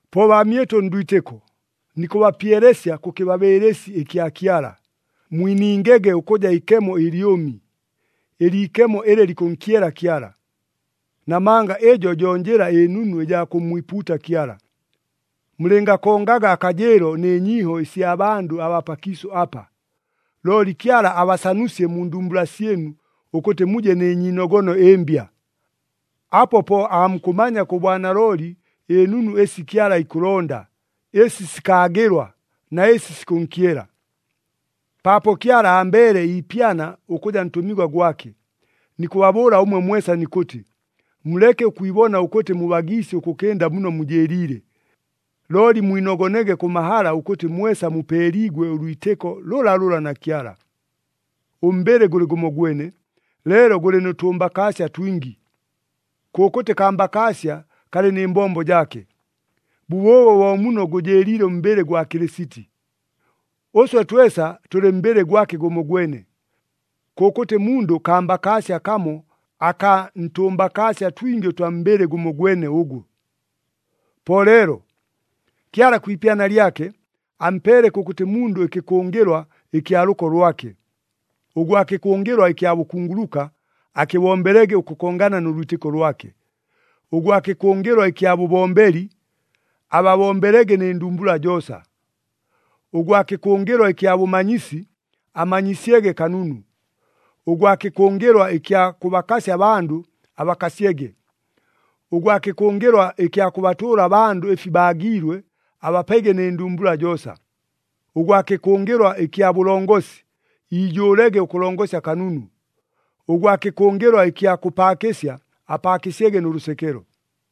Po baamyɨtʉ ndwitɨko, nikʉbapyelesya kʉ kɨbabɨɨlɨsi ɨkya Kyala, mwiningege ʉkʉja ikemo ɨlyʉmi, ɨliikemo ɨlɨ likʉnkyela Kyala. Namanga ɨjo jo njɨla ɨnunu ɨjaa kʉmmwipuuta Kyala. Mulɨngakongaga akajɨɨlo nɨ nyiiho ɨsya bandʉ abaa pakiisʉ apa, looli Kyala abasanusye mu ndumbula syɨnu ʉkʉtɨ muje nɨ nyiinogono ɨmbya. Apo po aamukʉmanya kʉ bwanalooli ɨnunu ɨsi Kyala ikʉlonda, ɨsi sikaagɨlwa na ɨsi sikʉnkyela. Paapo Kyala ambeele iipyana ʉkʉja ntʉmigwa gwake, nikʉbabʉʉla ʉmwe mwesa nikʉtɨ, muleke ʉkwibona ʉkʉtɨ mubagiisye ʉkʉkɨnda muno mujɨɨliile. Looli mwinogonege kʉ mahala ʉkʉtɨ mwesa mupeeliigwe ʉlwitɨko lʉlalʉla na Kyala. Ʉmbɨlɨ gʉlɨ gʉmogwene, leelo gʉlɨ nʉ tʉmbakaasya twingi. Kʉkʉtɨ kambakaasya kalɨ nɨ mbombo jaake. Bʉbʉʉbo bo muno gʉjɨɨliile ʉmbɨlɨ gwa Kɨlɨsiti. Ʉswe twesa tʉlɨ mbɨlɨ gwake gʉmogwene. Kʉkʉtɨ mundʉ kambakaasya kamo akaa ntʉmbakaasya twingi ʉtwa mbɨlɨ gʉmogwene ʉgo. Po leelo, Kyala kwi ipyana lyake, ampeele kʉkʉtɨ mundʉ ɨkɨkʉngɨlwa ɨkya lʉko lwake. Ʉgwa kɨkʉngɨlwa ɨkya bʉkunguluka, akɨbombelege ʉkʉkongana nʉ lwitɨko lwake. Ʉgwa kɨkʉngɨlwa ɨkya bʉbombeli, ababombelege nɨ ndumbula joosa. Ʉgwa kɨkʉngɨlwa ɨkya bʉmanyisi, amanyisyege kanunu. Ʉgwa kɨkʉngɨlwa ɨkya kʉbakasya abandʉ, abakasyege. Ʉgwa kɨkʉngɨlwa ɨkya kʉbatʉʉla abandʉ ɨfi baagiilwe, abapege nɨ ndumbula joosa. Ʉgwa kɨkʉngɨlwa ɨkya bʉlongosi, iijʉʉlege ʉkʉlongosya kanunu. Ʉgwa kɨkʉngɨlwa ɨkya kʉpaakɨsya, apaakɨsyege nʉ lʉsekelo.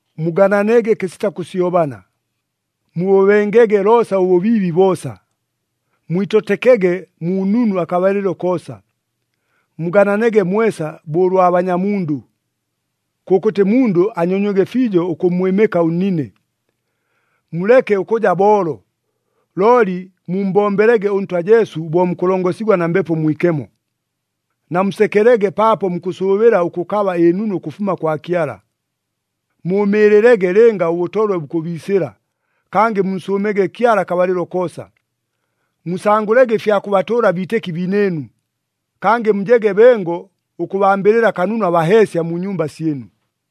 Mugananege kɨsita kʉsyobana. Mubʉbengege loosa ʉbʉbiibi boosa. Mwitotekege mu nunu akabalɨlo koosa. Mugananege mwesa bo ʉlwa banyamundʉ. Kʉkʉtɨ mundʉ anyonywege fiijo ʉkʉmmwɨmɨka ʉnnine. Muleke ʉkʉja boolo, looli mummbombelege ʉNtwa Jesu bo mukʉlongosigwa na Mbepo Mwikemo. Namusekelege paapo mukʉsʉʉbɨla ʉkʉkaba ɨnunu ʉkʉfuma kwa Kyala. Mʉʉmɨɨlɨlege lɨnga ʉbʉtolwe bukʉbiisɨla, kangɨ munsʉʉmege Kyala akabalɨlo koosa. Musangʉlege ɨfya kʉbatʉʉla abiitɨki biinɨɨnu. Kangɨ mujege bengo ʉkʉbambɨlɨla kanunu abaheesya mu nyumba syɨnu.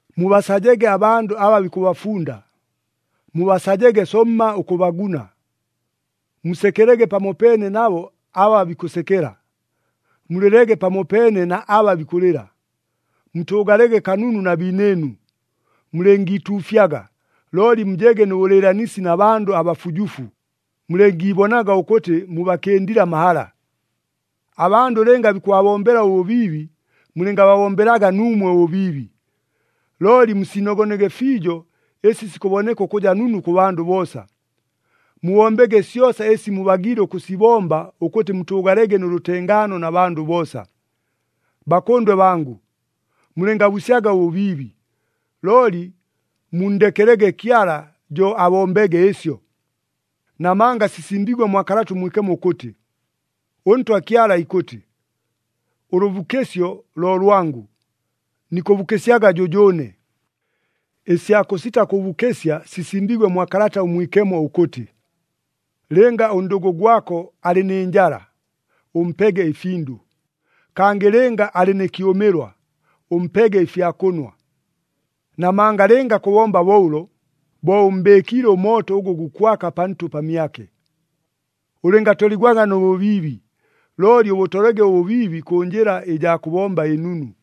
Mubasajege abandʉ aba bikʉbafunda, mubasajege somma ʉkʉbaguna. Musekelege pamopeene nabo aba bikʉsekela. Mulɨlege pamopeene na aba bikʉlɨla. Mutʉʉgalege kanunu na biinɨɨnu. Mulɨngiituufyaga, looli mujege nʉ bʉlɨɨlanisi na bandʉ abafujufu, mulɨngiibonaga ʉkʉtɨ mubakɨndile amahala. Abandʉ lɨnga bikʉbabombela ʉbʉbiibi, mulɨngababombelaga nuumwe ʉbʉbiibi. Looli musiinogonege fiijo ɨsi sikʉboneka ʉkʉja nunu kʉ bandʉ boosa. Mubombege syosa ɨsi mubagiile ʉkʉsibomba ʉkʉtɨ mutʉʉgalege nʉ lʉtengaano na bandʉ boosa. Bakʉndwe bangʉ, mulɨngabusyaga ʉbʉbiibi, looli munndekelege Kyala jo abombege ɨsyo. Namanga sisimbiigwe mwa Kalata ʉMwikemo ʉkʉtɨ, “ɄNtwa Kyala ikʉtɨ, ‘Ʉlʉbukɨsyo lo lwangʉ, nikʉbukɨsyaga jʉjʉʉne.’” Ɨsya kʉsita kʉbukɨsya sisimbiigwe mwa Kalata ʉMwikemo ʉkʉtɨ, “Lɨnga ʉndʉgʉ gwako alɨ nɨ njala, ʉmpege ɨfindʉ, kangɨ lɨnga alɨ nɨ kyʉmɨlwa, ʉmpege ɨfya kʉnwa. Namanga lɨnga kʉbomba bo ʉlo, bo ʉmmbɨɨkiile ʉmooto ʉgʉ gukwaka pantʉ pamyake.” Ʉlɨngatoligwaga nʉ bʉbiibi, looli ʉbʉtolege ʉbʉbiibi kʉ njɨla ɨjaa kʉbomba ɨnunu.